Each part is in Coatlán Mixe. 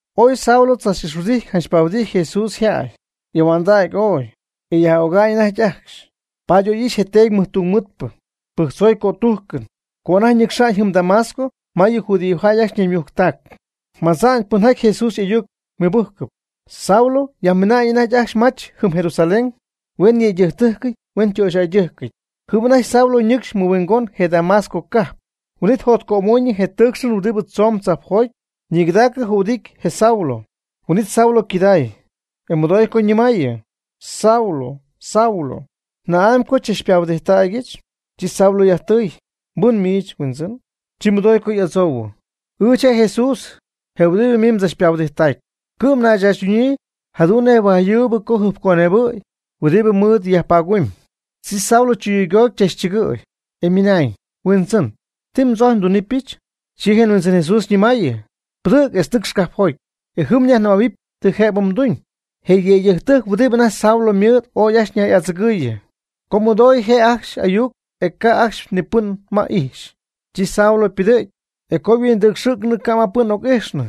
Ooy Saulo tzach'ixhuɨdijty pahuɨdijty Jesús yjäy, y'ahuändacy ooy, e yaj'öga'ñ anajty ajcxy. Paady oy ixy je teedy mɨjtungmɨɨdpɨ, pɨjctzoy cötújcɨn, co anajty ñɨcxa'ñ jɨm Damasco ma yɨ judíojäy ajcxy ñaymujctac, madza'ñ pɨnjaty Jesús y'ayuc mɨbɨ́jcɨp. Saulo yajmiina'ñ anajty ajcxy mach jɨm Jerusalén huen yëydɨjctɨ́jcɨty huen töxyjäydɨ́jcɨty. Jɨm anajty Saulo ñɨcxy mɨhuingoñ je Damasco cajp. Huin'it jotcömoñyɨ je tɨɨcxɨn huɨdi tzomb tzajpjoty, ñigɨdaacɨ jühuɨdity je Saulo. Huin'it Saulo ycɨday, e mɨdoy co ñɨmäyii: ―Saulo, Saulo, ¿na'amy co xychachpahuɨdijttägyɨch? Chi Saulo yajtɨy: ―¿Mbɨn miich, Huindzɨn? Chi mɨdoy co y'adzoyii: ―Ɨɨch je' Jesús, je huɨdibɨ miich mdzachpahuɨdijttacpy, cɨ'm nayyajtzaachytunyii jadu'n nej huajyuub co jɨjpconebɨ'y huɨdi mɨɨd ñuumygumyii. Chi Saulo chɨyuygoty chachchɨgɨɨy, e ymɨnañ: ―Huindzɨn, ¿ti mdzojcpy ndunɨpyɨch? Chi je Huindzɨn Jesús ñɨmaayɨ: ―Pɨdɨ̈g etz nɨcx cajpjoty, e jɨm nyajnɨmähuɨpy ti jëbɨ mduñ. Je yëydɨjctɨjc huɨdibɨ anajty Saulo ymɨɨd ooy ajcxy ñay'adzɨgɨɨyɨ, co mɨdoy je' ajcxy ayuc e ca' ajcxy ni pɨn ma y'ijxy. Chi Saulo ypɨdɨ̈gy, e co huindɨcxɨ̈cnɨ ca' pɨn ma oc'ijxnɨ.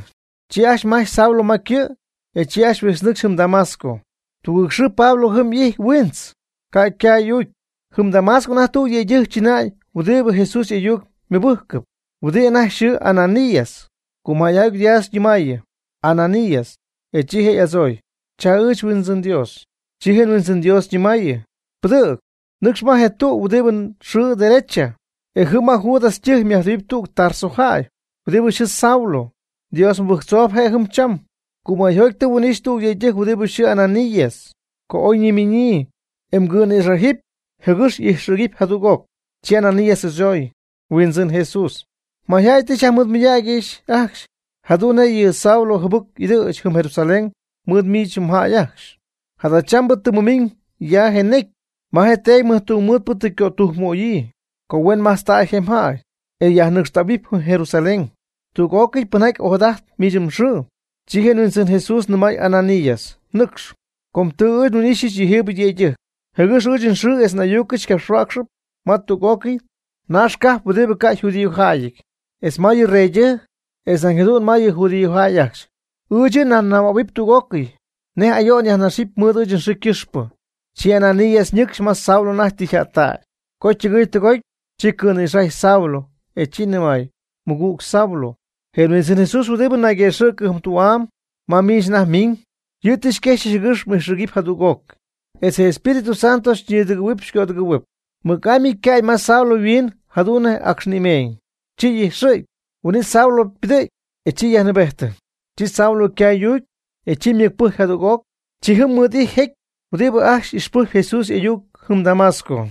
Chi ajcxy majch Saulo ma ycɨ', e chi ajcxy huijtznɨcxy jɨm Damasco. Tugɨɨg xɨɨ Pablo jɨm y'ijty huiintz, ca' ycaay y'uucy. Jɨm Damasco anajty tüg yëydɨjc chɨnäy huɨdibɨ Jesús y'ayuc mɨbɨ́jcɨp, huɨdi anajty yxɨɨ Ananías, cumäyjoty Dios ñɨmaayɨ: ―¡Ananías! E chi je' y'adzooy: ―Cha ɨɨch, Huindzɨn Dios. Chi je Huindzɨn Dios ñɨmaayɨ: ―Pɨdɨ̈g, nɨcx ma je tü huɨdibɨ yxɨɨ Derecha, e jɨm ma Judas ytɨjc yajtɨɨu tüg Tarso jäy, huɨdi yxɨɨ Saulo. Dios mɨbɨjctzoob je' jɨm cham, cumäyjoty tɨ huin'ijxy tüg yëydɨjc huɨdi yxɨɨ Ananías, co oy ñimiñyii, e ycɨ̈nïxajɨɨy jɨgɨx y'ijxɨ̈gɨp jadüg'oc. Chi Ananías y'adzooy: ―Huindzɨn Jesús, mayjäy tɨ xyajmɨɨdmɨydägyɨch ajcxy jadu'n nej yɨ Saulo jɨbɨc y'ɨdɨ̈ch jɨm Jerusalén mɨɨd miich mjäy ajcxy. Jadachambɨ tɨ mɨmiiñ ya je necy, ma teedy mɨjtungmɨɨdpɨ tɨ ycötujcmöyii, co huen majtztäy je jäy, e yajnɨcxtähuɨpy jɨm Jerusalén, tüg'ócɨy pɨnjaty ojadajtp miich mxɨɨ. Chi je Huindzɨn Jesús nɨmay Ananías: ―Nɨcx, com tɨ ɨɨch nhuin'ixy yɨjiibɨ yëydɨjc, jɨgɨx ɨɨch nxɨɨ etz n'ayucɨch capxhuäcxɨpy ma tüg'ócɨy naax cajp huɨdi ca' yjudíojäyɨty, etz ma yɨ reydɨjc, etz nañ jadu'n ma yɨ judíojäy ajcxy. Ɨɨch yɨ' nyajnɨmähuɨpy tüg'ócɨy, nej ayo'n yajnaxɨpy mɨɨd ɨɨch nxɨɨ ycɨxpɨ. Chi Ananías ñɨcxy ma Saulo anajty tɨ yjättägy, co ytɨgɨɨy tɨgoty, chi cɨ̈nïxajy Saulo, e chi nɨmay: ―Mɨgüg Saulo, je Huindzɨn Jesús huɨdibɨ nayguëxɨ̈cɨ jɨm tü'am ma miich anajty miiñ, yɨ' tɨ xyquexyɨch jɨgɨx m'ijxɨ̈gɨpy jadüg'oc, etz je Espíritu Santo xyñïdɨgɨ̈huɨp xycödɨgɨ̈huɨp. Mɨc'amy ycäy ma Saulo yhuiin jadu'n nej acx ñïmeeñ, chi y'ijxɨ̈gy. Huin'it Saulo ypɨdɨ̈gy e chi yajnɨɨbejtɨ. Chi Saulo ycaay y'uucy, e chi ymɨc'pɨjcy jadüg'oc. Chi jɨm mɨɨd'ijty jecy huɨdibɨ ajcxy ixpɨjcɨp Jesús y'ayuc jɨm Damasco.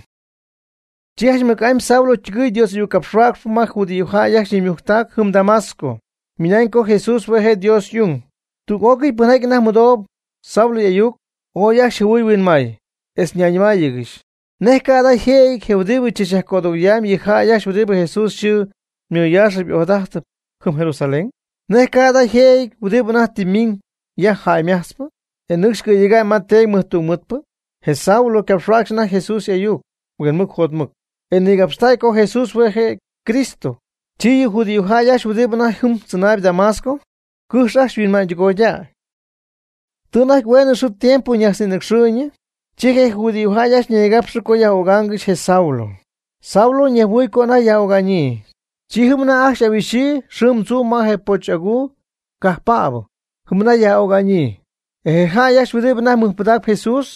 Chi janch mɨc'amy Saulo ytɨgɨɨy Dios y'ayuccapxhuäcxp ma je judíojäy ajcxy ñaymujctac jɨm Damasco, ymɨnañ co je Jesús hue' je' Dios y'ung. Tüg'ócɨy pɨnjaty anajty mɨdoohuɨp Saulo y'ayuc, ooy ajcxy jɨhuɨɨy huinmaay, etz ñayñɨmáayɨgɨxy: ―¿Nej ca' jada' yjëjɨty je huɨdibɨ tzachyajcödɨgoyam yɨ jäy ajcxy huɨdibɨ Jesús yxɨɨ mɨyaax ojadájtɨp jɨm Jerusalén? ¿Nej ca' jada yjëjɨty huɨdi anajty tɨ ymiiñ ya jäy ymajtzpɨ, e nɨcxy cɨ̈yega'ñ ma teedy mɨjtungmɨɨdpɨ? Je Saulo capxhuacxɨp anajty Jesús y'ayuc huinmɨc jotmɨc, e nigapxtäy co Jesús hue' je' je Cristo, chi yɨ judíojäy ajcxy huɨdi anajty jɨm tzɨnaayb Damasco cɨjx ajcxy yhuinma'ñ tɨgoydäy. Tɨ anajty hueenɨ xɨɨ tiempo ñajtznïnɨcxɨɨyñɨ, chi je judíojäy ajcxy ñaygapxɨ co yaj'ögaangɨxy je Saulo. Saulo ñejhuɨɨy co anajty yaj'öga'ñyii. Chi jɨm anajty ajcxy y'ahuixyii xɨɨm tzuum ma je poch aguu cajppäbɨ, jɨm anajty yaj'öga'ñyii. E je jäy ajcxy huɨdibɨ anajty ymɨjpɨdacpy Jesús,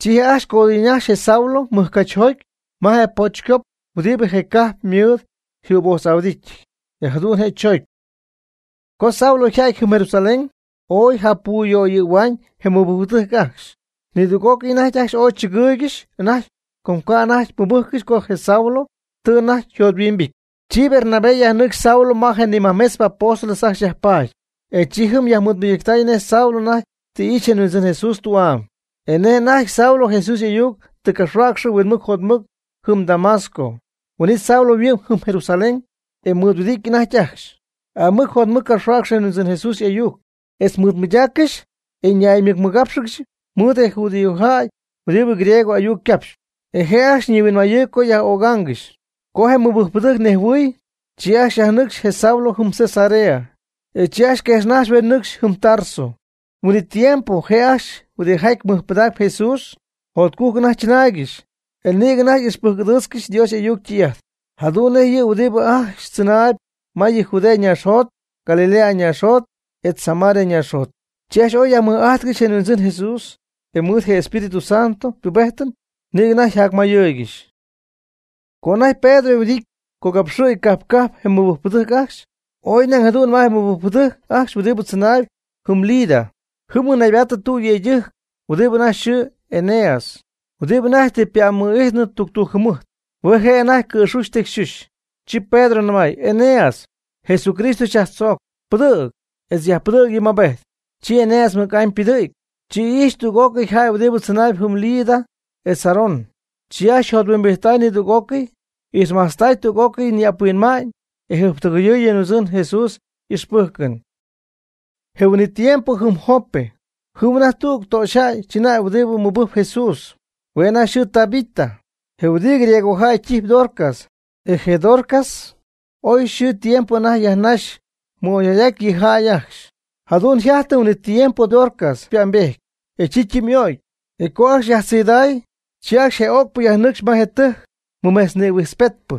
chi je' ajcxy codɨɨyñajxy je Saulo mɨjcachjoty ma je pochycop huɨdi je cajp mɨɨd jübojtz'ahuɨdítyɨty, e jadu'n je' choocy. Co Saulo yja'ty jɨm Jerusalén, oy japuyöyɨ̈huaañ je mɨbɨjcpɨdɨjc ajcxy. Nidüg'ócɨy anajty ajcxy ooy tzɨgɨɨygɨxy anajty com ca' anajty mɨbɨjccɨxy co je Saulo tɨ anajty yjothuimbity. Chi Bernabé yajnɨcxy Saulo ma je nimajmetzp apóstoles ajcxy yajpaady, e chi yajmɨɨdmɨydactay nej Saulo anajty tɨ ixy je Huindzɨn Jesús tü'am, e nej anajty Saulo Jesús y'ayuc tɨ capxhuäcxɨ huinmɨc jotmɨc jɨm Damasco. Huin'it Saulo yhuɨ'my jɨm Jerusalén, e mɨɨd huɨdity anajty ajcxy. Aamɨc jotmɨc capxhuäcxy je Huindzɨn Jesús y'ayuc, etz mɨɨd mɨydaaccɨxy e ñaymɨcmɨgápxɨgɨxy mɨɨd je judíojäy huɨdibɨ griego ayuc caxp. E je' ajcxy nihuinmayɨɨyb co yaj'ögaangɨxy. Co je mɨbɨjcpɨdɨjc nejhuɨɨy, chi ajcxy yajnɨcxy je Saulo jɨm Cesarea, e chi ajcxy quejxnajxy huen nɨcxy jɨm Tarso. Huin'it tiempo je' ajcxy huɨdijaty mɨjpɨdacp Jesús, jotcujc anajty chɨnaaygɨxy, e nïgɨ anajty ixpɨjc'ɨdɨ̈ch Dios y'ayuc ytɨy'ajt, jadu'n nej yɨ huɨdibɨ ajcxy tzɨnaayb ma yɨ Judea ñaaxjot, Galilea ñaaxjot, etz Samaria ñaaxjot. Chi ajcxy ooy yajmɨj'ajtcɨxy je Huindzɨn Jesús, e mɨɨd je Espíritu Santo ypubéjtɨn, nïgɨ anajty yjacmayɨɨygɨxy. Co anajty Pedro yhuɨdijty cogapxɨ̈y cajp cajp je mɨbɨjcpɨdɨjc ajcxy, y'oy nañ jadu'n ma je mɨbɨjcpɨdɨjc ajcxy huɨdibɨ tzɨnaayb jɨm Lida. Jɨm mɨnaybaattɨ tüg yëydɨjc huɨdibɨ anajty yxɨɨ Eneas, huɨdibɨ anajty tɨ ypa'm'ijtnɨ tuctujc jɨmɨjt, hue' je' anajty ycɨ̈xuxy ytecyxuxy. Chi Pedro nɨmay: ―Eneas, Jesucristo xyajtzoocp, pɨdɨ̈g, etz yajpɨdɨ̈g yɨ mmaabejt. Chi Eneas mɨc'amy ypɨdɨ̈gy. Chi ijxy tüg'ócɨy jäy huɨdibɨ tzɨnaayb jɨm Lida etz Sarón. Chi ajcxy yjothuimbijttay nidüg'ócɨy, ixmajtztay tüg'ócɨy yɨ ñi'ap huinma'ñ e jɨjptɨgɨyɨɨy yɨ Huindzɨn Jesús y'ixpɨ́jcɨn. Je huin'it tiempo jɨm Jope, jɨm anajty tüg töxyjäy chɨnäy huɨdibɨ mɨbɨjcp Jesús, hue' anajty yxɨɨ Tabita, je' huɨdi griegojäy ytijyp Dorcas. E je Dorcas oy xɨɨ tiempo anajty yajnaxy mɨ'oyjäy'aty yɨ jäy ajcxy. Jadu'n yjajtɨ huin'it tiempo Dorcas ypa'mbejty, e chi ytɨmy'o'cy. Co ajcxy yajtziiday, chi ajcxy je öcpɨ yajnɨcxy ma je tɨjc mɨmejtznïhuijtzpetypɨ.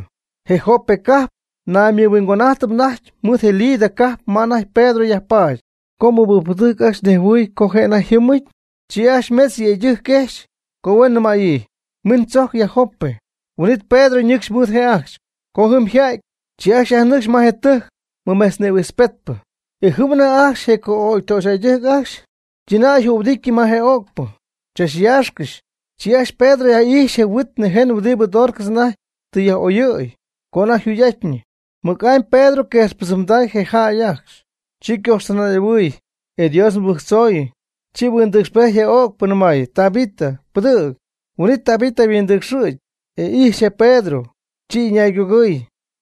Je Jope cajp naymɨhuingon'ájtɨp anajty mɨɨd Lida cajp ma anajty Pedro yajpaady, co mɨbɨjcpɨdɨjc ajcxy anajty nejhuɨy co je' anajty yjɨ́mɨty, chi ajcxy mejtz yëydɨjc quejxy co huen nɨmäyii: ―Min tzojc ya Jope. Huin'it Pedro ñɨcxy mɨɨd je' ajcxy. Co jɨm yja'ty, chi ajcxy yajnɨcxy ma je tɨjc mɨmejtznïhuijtzpetypɨ, e jɨm anajty ajcxy je co'ögy töxyjäydɨjc ajcxy ytɨnayjühuɨdityɨ ma je öcpɨ, chachyaaxcɨxy. Chi ajcxy Pedro yaj'ijxy je huit nïjen huɨdibɨ Dorcas anajty tɨ yaj'oyɨ̈y co anajty yjugy'atyñɨ. Mɨc'amy je Pedro quejxpɨdzɨmday je jäy ajcxy. Chi ycoxtɨnay'ahuɨɨy, e Dios mɨbɨjctzoy. Chi huindɨcxpejty je öcpɨ, nɨmay: ―Tabita, pɨdɨ̈g. Huin'it Tabita yhuindɨcxɨ̈gy, e ijxy je Pedro, chi ɨñaygugɨɨy.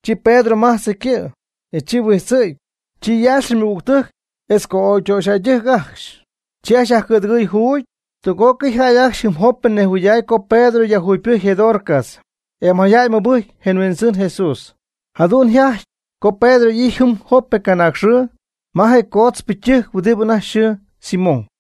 Chi Pedro majtzɨ ycɨ', e chi huijtzɨ̈gy. Chi yaaxɨ ymɨgügtɨjc etz co'ögytöxyjäydɨjc ajcxy, chi ajcxy yajcɨ̈dɨgɨɨy juugy. Tüg'ócɨy jäy ajcxy jɨm Jope nejhuɨyday co Pedro yajjugypɨjcy je Dorcas. E mayjäy mɨbɨjcy je Huindzɨn Jesús. Jadu'n yjajty co Pedro y'ijty jɨm Jope canaag xɨɨ ma je coodzpɨ ytɨjc huɨdi anajty yxɨɨ Simón.